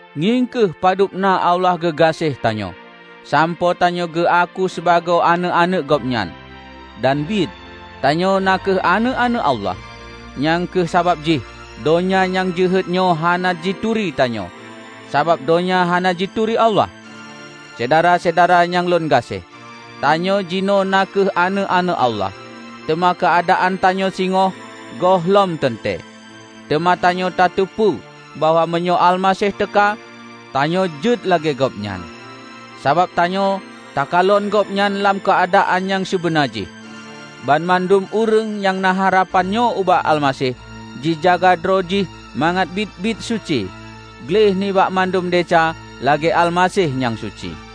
Ngieng kheueh padub na Allah geugaséh tanyoe, sampoe tanyoe geuaku sibagoe aneuëk-aneuëk Gobnyan. Dan biet, tanyoe na kheueh aneuëk-aneuëk Allah. Nyang kheueh sabab jih donya nyang jeuhet nyoe hana jituri tanyoe, sabab donya hana jituri Allah. Syedara-syedara nyang lôn gaséh! Tanyoe jinoe na kheueh aneuëk-aneuëk Allah, teuma keuadaan tanyoe singoh gohlom teuntée. Teuma tanyoe tateupeue bahwa meunyoe Almaseh teuka, tanyoe jeuet lagée Gobnyan, sabab tanyoe takalon Gobnyan lam keuadaan nyang sibeuna jih. Banmandum ureuëng nyang na harapan nyoe ubak Almaseh, jijaga droe jih mangat biet-biet suci, gleh nibak mandum desya lagée Almaseh nyang suci.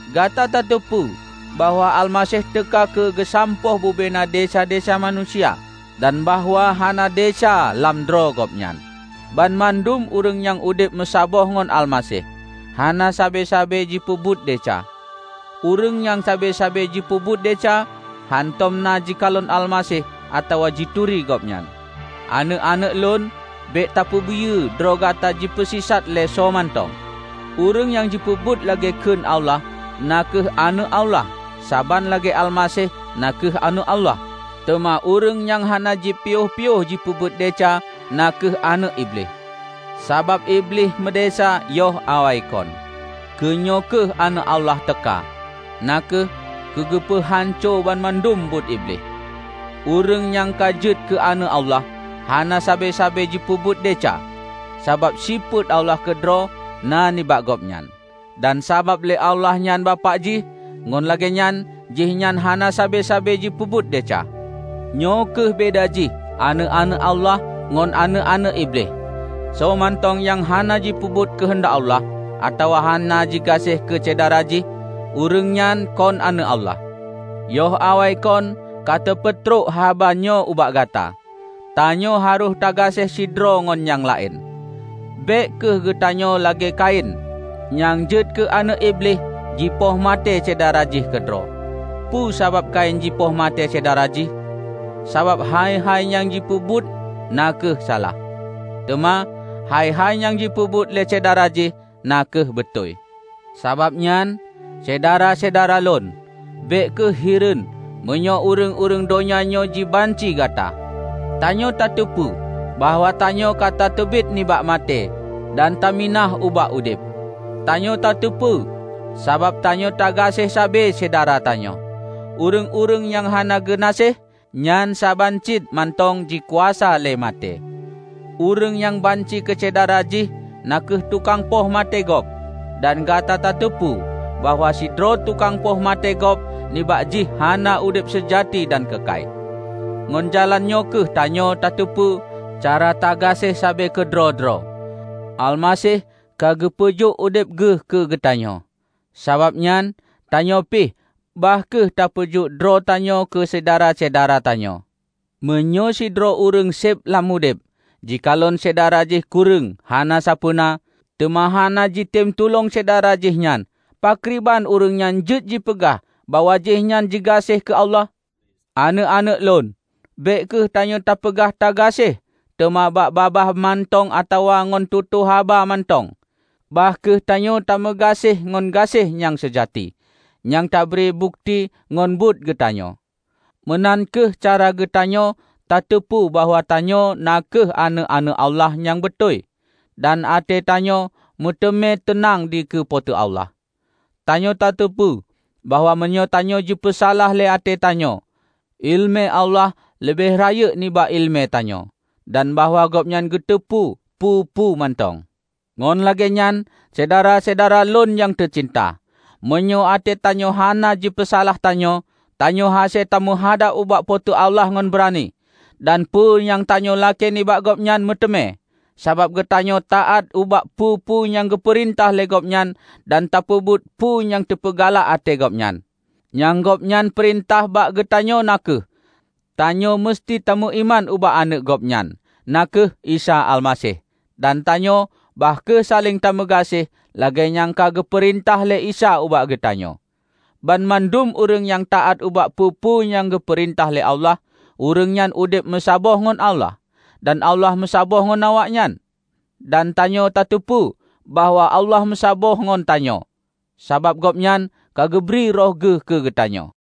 Gata tateupeue bahwa Almaseh teuka keu geusampôh bubena desya-desya manusia, dan bahwa hana desya lam droe Gobnyan. Banmandum ureuëng nyang udeb meusaboh ngon Almaseh, hana sabe-sabe jipeubuet desya. Ureuëng nyang sabe-sabe jipeubuet desya, hántom na jikalon Almaseh atawa jituri Gobnyan. Aneuëk-aneuëk lôn, bék tapeubiyeue droe gata jipeusisat lé soemantong. Ureuëng nyang peubuet lagée kheun Allah na kheueh aneuëk Allah saban lagée Almaseh na kheueh Aneuëk Allah. Teuma ureuëng nyang hana jipiôh-piôh jipeubuet desya na kheueh aneuëk Iblih, sabab Iblih meudesya yoh awaikon. Keunyoe kheueh Aneuëk Allah teuka, na kheueh keugeupeuhanco banmandum buet Iblih. Ureuëng nyang ka jeuet keu Aneuëk Allah, hana sabe-sabe jipeubuet desya, sabab sifeuet Allah keudroe na nibak gobnyan. Dan sabab lé Allah nyan Bapak jih, ngon lagée nyan jihnyan hana sabe-sabe jipeubuet desya. Nyoe kheueh beda jih aneuëk-aneuëk Allah ngon aneuëk-aneuëk Iblih: soe mantong nyang hana jipeubuet keuheundak Allah, atawa hana jigaséh keu syedara jih, ureuëng nyan kon aneuëk Allah. Yoh awaikon ka teupeutrok haba nyoe ubak gata: Tanyoe harôh tagaséh sidroe ngon nyang laén. Bék kheueh geutanyoe lagée Kain, nyang jeuet keu aneuëk Iblih jipoh maté syedara jih keudroe. Peue sabab Kain jipoh maté syedara jih? Sabab hai-hai nyang jipeubuet na kheueh salah, teuma hai-hai nyang jipeubuet lé syedara jih na kheueh beutôi. Sabab nyan, Syedara-syedara lôn, bék kheueh hireuen meunyoe ureuëng-ureuëng donya nyoe jibanci gata. Tanyoe tateupeue bahwa tanyoe ka tateubiet nibak maté, dan taminah ubak udeb. Tanyoe tateupeue, sabab tanyoe tagaséh sabe syedara tanyoe. Ureuëng-ureuëng nyang hana geunaséh, nyan saban cit mantong jikuasa lé maté. Ureuëng nyang banci keu syedara jih na kheueh tukang poh maté gob, dan gata tateupeue bahwa sidroe tukang poh maté gob nibak jih hana udeb seujati dan keukai. Ngon jalan nyoe kheueh tanyoe tateupeue cara tagaséh sabe keudroe-droe: Almaseh ka geupeujok udeb Geuh keu geutanyoe. Sabab nyan, tanyoe pih bah kheueh tapeujok droe tanyoe keu syedara-syedara tanyoe! Meunyoe sidroe ureuëng seb lam udeb jikalon syedara jih kureueng hana sapeue na, teuma hana jitem tulông syedara jih nyan, pakriban ureuëng nyan jeuet jipeugah bahwa jihnyan jigaséh keu Allah? Aneuëk-aneuëk lôn! Bék kheueh tanyoe tapeugah tagaséh teuma bak babah mantong atawa ngon tutoe haba mantong. Bah kheueh tanyoe tameugaséh ngon gaséh nyang seujati, nyang tabri bukeuti ngon buet geutanyoe. Meunan kheueh cara geutanyoe tateupeue bahwa tanyoe na kheueh aneuëk-aneuëk Allah nyang beutôi, dan até tanyoe meuteumé teunang dikeue Po teu Allah. Tanyoe tateupeue, bahwa meunyoe tanyoe jipeusalah lé até tanyoe, iéleumé Allah leubeh rayeuk nibak iéleumé tanyoe, dan bahwa Gobnyan geuteupeue peue-peue mantong. Ngon lagée nyan, Syedara-syedara lôn nyang teucinta, meunyoe até tanyoe hana jipeusalah tanyoe, tanyoe hase tameuhadab ubak Po teu Allah ngon beurani. Dan peue nyang tanyoe lakée nibak Gobnyan, meuteumé, sabab geutanyoe taát ubak peue-peue nyang geupeurintah lé Gobnyan dan tapeubuet peue nyang teupeugalak até Gobnyan. Nyang Gobnyan peurintah bak geutanyoe na kheueh: Tanyoe meuseuti tameuiman ubak Aneuëk Gobnyan, na kheueh Isa Almaseh, dan tanyoe bah kheueh saléng tameugaséh, lagée nyang ka geupeurintah lé Isa ubak geutanyoe. Banmandum ureuëng nyang taát ubak peue-peue nyang geupeurintah lé Allah, ureuëng nyan udeb meusaboh ngon Allah, dan Allah meusaboh ngon awaknyan. Dan tanyoe tateupeue bahwa Allah meusaboh ngon tanyoe, sabab Gobnyan ka geubri Roh Geuh keu geutanyoe.